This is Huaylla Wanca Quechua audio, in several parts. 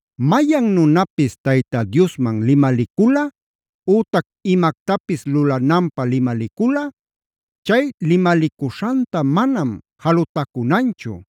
Mayan nunapis Tayta Diosman limaliculꞌa, ütac imactapis lulananpä limaliculꞌa, chay limalicuśhanta manam jalutacunanchu;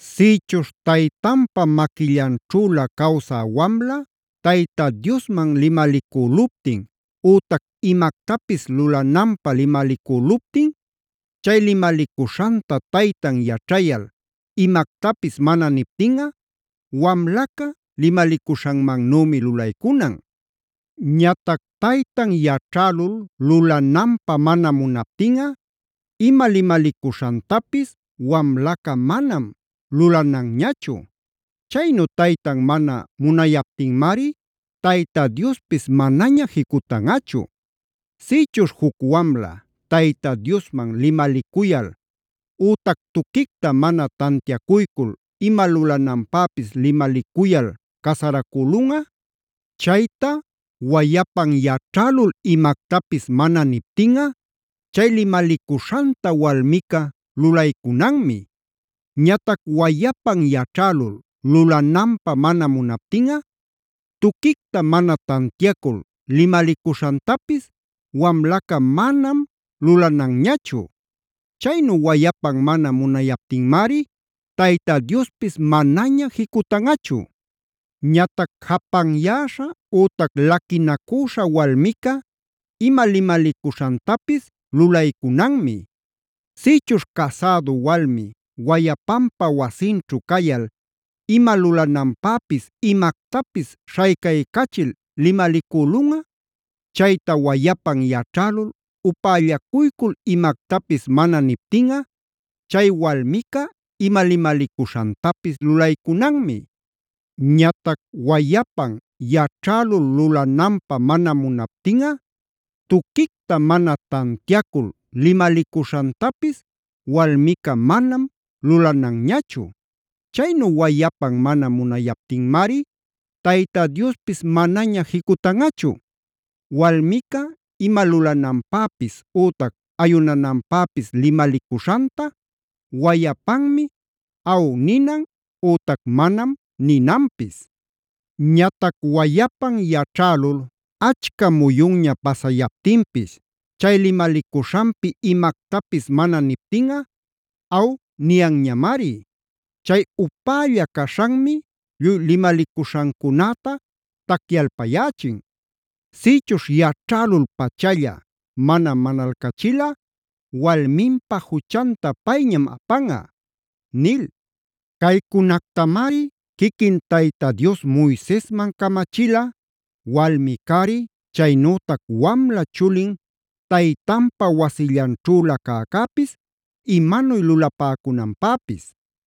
“Sïchuśh taytanpa maquillanćhüla cawsä wamla Tayta Diosman limalicüluptin ütac imactapis lulananpä limalicüluptin, chay limalicuśhanta taytan yaćhayal imactapis mana niptinꞌa, wamlaca limalicuśhanmannümi lulaycunan. Ñatac taytan yaćhälul lulananpä mana munaptinꞌa ima limalicuśhantapis wamlaca manam lulananñachu. Chaynu taytan mana munayaptinmari Tayta Diospis manaña jicutanꞌachu. “Sïchuśh juc wamla Tayta Diosman limalicuyal ütac tuquicta mana tantiacuycul ima lulananpäpis limalicuyal casaracülunꞌa, chayta wayapan yaćhälul imactapis mana niptinꞌa, chay limalicuśhanta walmica lulaycunanmi. Ñatac wayapan yaćhälul lulananpä mana munaptinꞌa, tuquicta mana tantiacul limalicuśhantapis wamlaca manam lulananñachu. Chaynu wayapan mana munayaptinmari Tayta Diospis manaña jicutanꞌachu. “Ñatac japanyäśha ütac laquinacüśha walmica ima limalicuśhantapis lulaycunanmi. “Sïchuśh casädu walmi wayapanpa wasinćhu cayal ima lulananpäpis imactapis śhaycaycachil limalicülunꞌa, chayta wayapan yaćhälul upällacuycul imactapis mana niptinꞌa chay walmica ima limalicuśhantapis lulaycunanmi. Ñatac wayapan yaćhälul lulananpä mana munaptinꞌa, tuquicta mana tantiacul limalicuśhantapis walmica manam lulananñachu. Chaynu wayapan mana munayaptinmari Tayta Diospis manaña jicutanꞌachu. “Walmica ima lulananpäpis ütac ayunananpäpis limalicuśhanta wayapanmi ‘aw’ ninan ütac ‘manam’ ninanpis. Ñatac wayapan yaćhälul achca muyunña pasayaptinpis chay limalicuśhanpi imactapis mana niptinꞌa ‘aw’ niyanñamari. Chay upälla caśhanmi lluy limalicuśhancunäta tacyalpayächin. Sïchuśh yaćhälul-pachalla mana manalcachilꞌa walminpa juchanta payñam apanꞌa” nil. Caycunactamari quiquin Tayta Dios Moisesman camachila, walmi-cari, chaynütac wamla chulin taytanpa wasillanćhüla cäcäpis imanuy lulapäcunanpäpis.